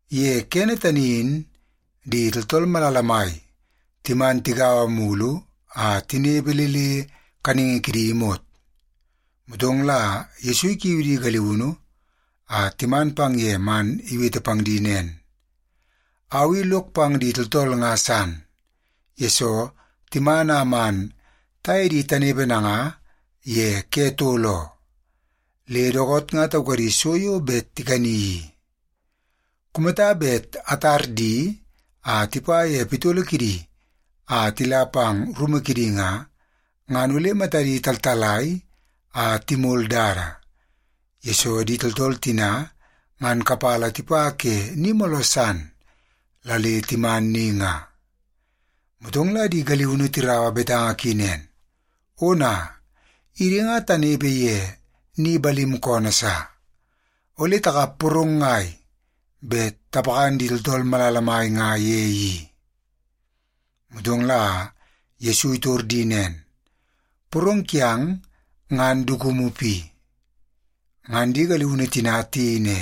Ye kene tani in di tooltool malala mai timan tigaua mulu a tinepe le le kaningi kidi imot, motong la Yesu ikiu di galiunu a timan pang ye man iwete pang di nen, “Au i lok pang di tooltool nga san, yesoo timan a man taye di tanepe nanga ye ke tol oo, le dookoot nga taukadi so yo bet tikani i. Kumata bet atar di a tipa ye pitolo kidi a tila pang rumu kidi nga, ngan ole matadi taltalai a timol dada, yesoo di tooltool tina ngan kapala tipa ke ni mooloo san la le timan ni nga.” Motong la di galiunu tiraua betanga ki nen, “Ona, idi nga tanepe ye ni balim koonoo sa! Ole takap porong ngai bet tapakan di tooltool malala mai nga ye i?” Motong la Yesu itor di nen, “Porong kiang ngan dukumu pi?” Ngan di galiunu tina tiyei ne,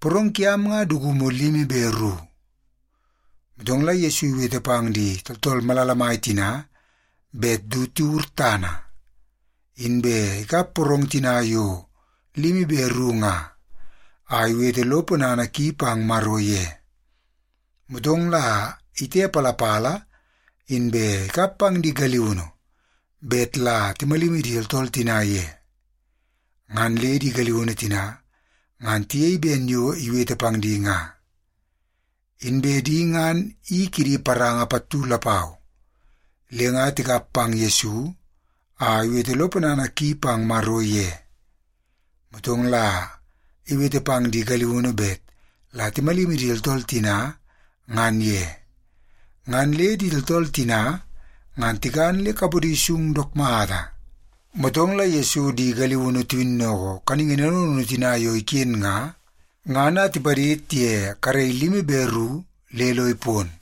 “Porong kiam nga dukumu limi be ru.” Motong la Yesu iwete pang di tooltool malala mai tina bet du tiwur tana. Inbe ikap porong tina yo limi be ru nga, a iwete lo ponana ki pang Maro ye. Motong la itepalapala, inbe ikap pang di galiunu bet la timalimi di tooltool tina ye. Ngan le di galiunu tina ngan tiyei ben yo iwete pang di nga. Inbe di ngan i kidi paranga pattu lapau, le nga tikap pang Yesu a iwete lo ponana ki pang Maro ye. Motong la iwete pang di galiunu bet la timalimi di tooltool tina ngan ye. Ngan le di tooltool tina ngan tikan le kapodi sung dook mata. Motong la Yesu di galiunu tiwinnoko kaningi naunu naunu tina yo iken nga, ngan a tipadid ye karei limi be ru le lo ipon.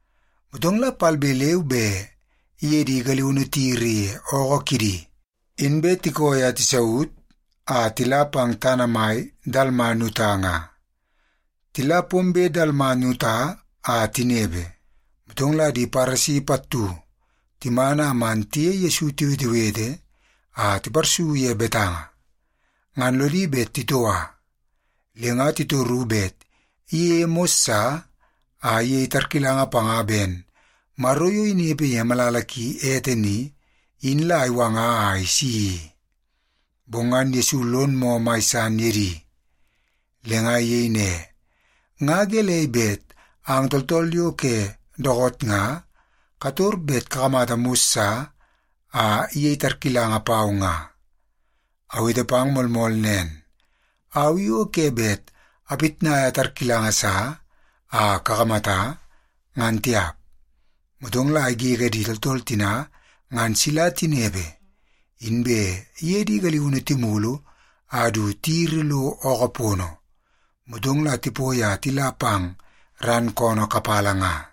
Motong la palbe leu be iye di galiunu tiyiri ye ookoo kidi, inbe tikooi a tisaut a tila pang tana mai Dalmanuta nga. Tila pombe Dalmanuta a tinepe, motong la di Paresi pattu timan a man tiye Yesu tiwetewete a tiparsu ye betanga. Ngan lodi bet titoua, le nga titoru bet iyeie mos sa a iyei tarkilanga panga ben Maro yo inepe ye malala ki ete ni, in la iwanga a isi i. Bong ngan Yesu lon moo mai san ye di. Le nga iyei ne, “Nga gelei bet ang tooltool yo ke dookoot nga kator bet kakamata mos sa a iyei tarkilanga pau nga? Awete pang moolmool nen, au i o ke bet apitnaia tarkilanga sa a kakamata, ngan tiap.” Motong la igege di tooltool tina ngan sila tinepe, inbe iye di galiunu timulu a du tiyiri lo ookoo pono, motong la tipoi a tila pang ran koonoo kapala nga.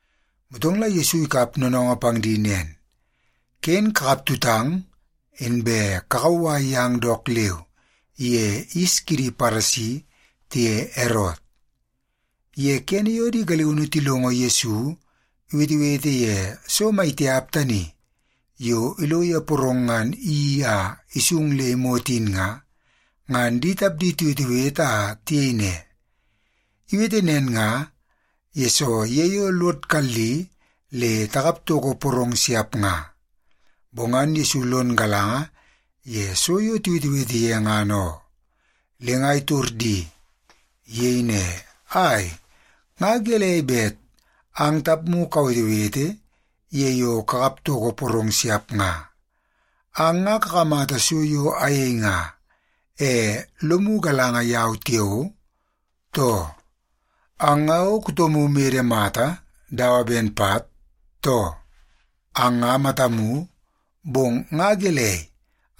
Motong la Yesu ikap noonoongoo pang di nen, “Ken kakap tutang, inbe kakauwai yang dook leu ye yis kidi Paresi tiye Erot.” Ye kene yo di galiunu tilongo Yesu iwetewete ye so maitiap tani yo ilo ye porong ngan iyeii a isung le imot in nga, ngan di tapdi tiwetewete a tiyei ne, “Iwete nen nga, yesoo ye yo lod kalli le takap toko porong siap nga.” Bong ngan Yesu lon galanga ye so yo tiwetewete ye ngan oo, le nga itor di. Iyei ne, “Ai, nga gelei bet ang tapmu kawetewete ye yo kakap toko porong siap nga? Ang nga kakamata so yo ayei nga, e lomu galanga yau tiao, too? Ang nga o kutomu mede mata dawa ben pat, too? Ang nga matamu, bong nga gelei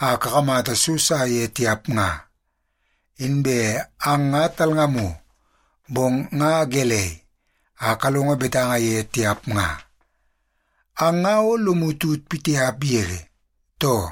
a kakamata so sa ye tiap nga? Inbe ang nga talngamu, bong nga gelei a kalongo betanga ye tiap nga? Ang nga o lomu tut pitiap yege, too?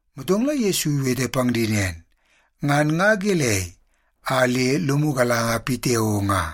Motong la Yesu iwete pang di nen, “Ngan nga gelei a le lomu galanga pitiao nga?”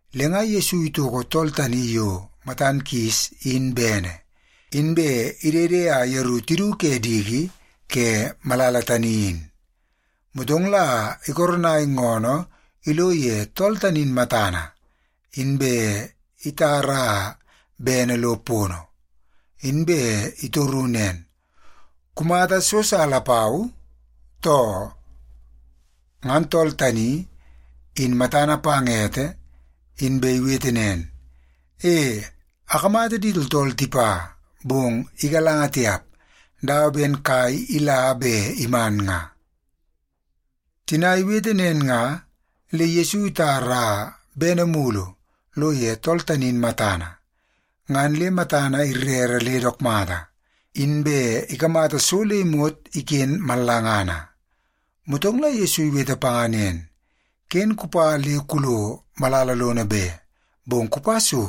Le nga Yesu itoko tool tani yo matan kis in bene, inbe idede a yeru tidu ke diki ke malala tani in. Motong la ikoronai ngoonoo ilo ye tool tani in matana, inbe itara bene lo pono. Inbe itoru nen, “Kumata so sa lapau, too?” Ngan tool tani in matana pang ete, inbe iwete nen, “E, akamata di tooltool tipa, bong igalanga tiap, dawa ben kai ila be iman nga.” Tina iwete nen nga, le Yesu itara bene mulu lo ye tool tani in matana. Ngan le matana irere le dook mata, inbe ikamata so le imot iken mallangana. Motong la Yesu iwete panga nen, “Ken kupa le kulo malala lono be, bong kupa so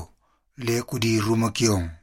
le kudi rumu kiong.”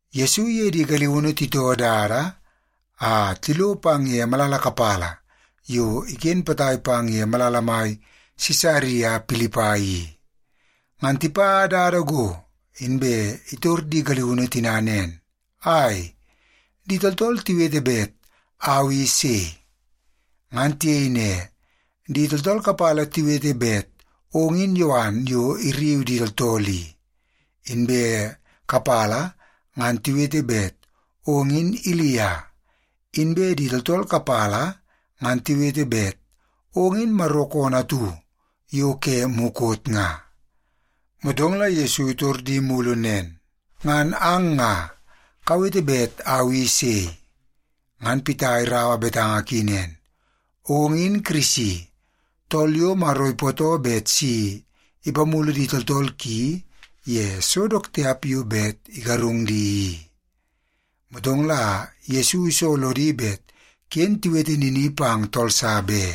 Yesu iye di galiunu titoo dada a tilo pang ye malala kapala yo iken potai pang ye malala mai Sisaria Pilipai i. Ngan tipa dada go, inbe itor di galiunu tina nen, “Ai, di tooltool tiwete bet au i sei?” Ngan tiyei ne, “Di tooltool kapala tiwete bet ong in Yowan yo irriu di tooltool i, inbe kapala ngan tiwete bet ong in Ilia. Inbe di tooltool kapala ngan tiwete bet ong in Maro koonoo atu yo ke mukot nga.” Motong la Yesu itor di mulu nen, “Ngan ang nga, kawete bet au i sei?” Ngan Pita iraua betanga ki nen, “Ong in Kirisi, tool yo Maro ipootoo bet si ipamulu di tooltool ki ye so dook tiap yo bet igarung di i.” Motong la Yesu iso lodi bet ken tiwete nini pang tool sa be.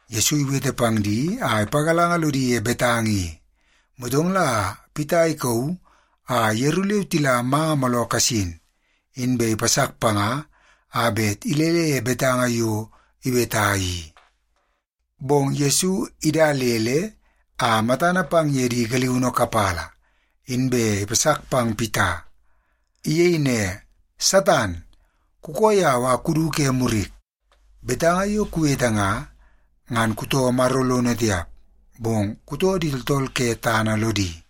Yesu iwete pang di a ipagalanga lodi ye betanga i, motong la Pita ikauu a yeru leu tila manga mooloo kasin, inbe ipasak panga a bet ilele ye betanga yo iweta i. Bong Yesu idalele a matana pang ye di galiunu kapala, inbe ipasak pang Pita. Iyei ne, “Satan, kukoo yau a kudu ke murik. Betanga yo kuwete nga, ngan kutoo Maro lono tiap, bong kutoo di tooltool ke tana lodi.”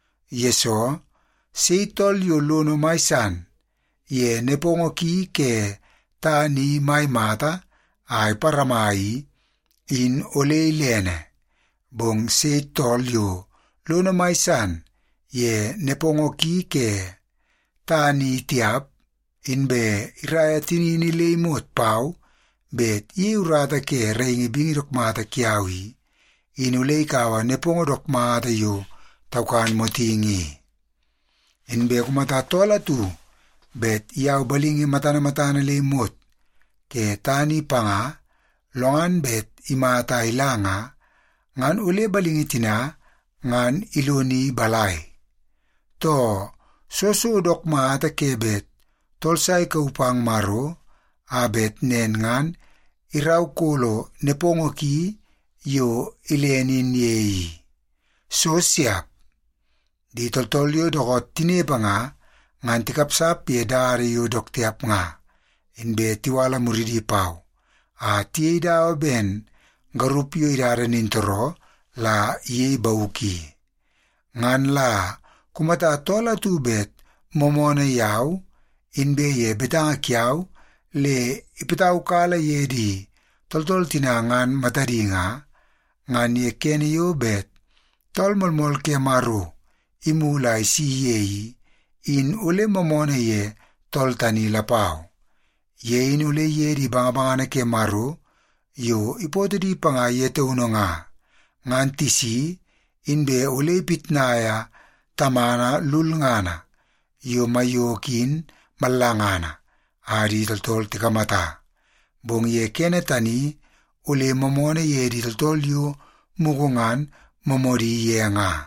Yesoo, sei tool yo lono mai san ye nepongo ki ke tana i mai mata a iparama i, in ole ilene. Bong sei tool yo lono mai san ye nepongo ki ke tana i tiap, inbe iraia tinini le imot pau bet iyei urata ke bingi dook mata kiau i, in ole ikaua nepongo dook mata yo taukan motingi i. Inbe kumata tool atu bet iyau balingi matana matana le imot ke tana i panga, lo ngan bet imata a ila nga, ngan ole balingi tina ngan iloni balai? Too, soo so dook mata ke bet tool sa ikauu pang Maro a bet nen ngan iraukolo nepongo ki yo ilene in ye i? So siap! Di tooltool yo dookoot tinepe nga, ngan tikapsap ye dada yo dook tiap nga, inbe tiwala muridi pau a tiyei dawa ben garup yo idada nintooroo la iyei bauk i. Ngan la kumata tool atu bet moomoonoo yau inbe ye betanga kiau le ipataukala ye di tooltool tina ngan matadi nga, ngan ye kene yo bet Tool Moolmool ke Maro imulu a isi ye i, in ole moomoonoo ye tool tani lapau. Ye in ole iye di bangabangana ke Maro yo ipootoo di panga ye taunu nga, ngan tisi inbe ole ipitnaia Tamana lulngana yo maiyoko in mallangana a di tooltool tikamata, bong ye kene tani ole moomoonoo ye di tooltool yo mugu ngan moomoodi ye nga.”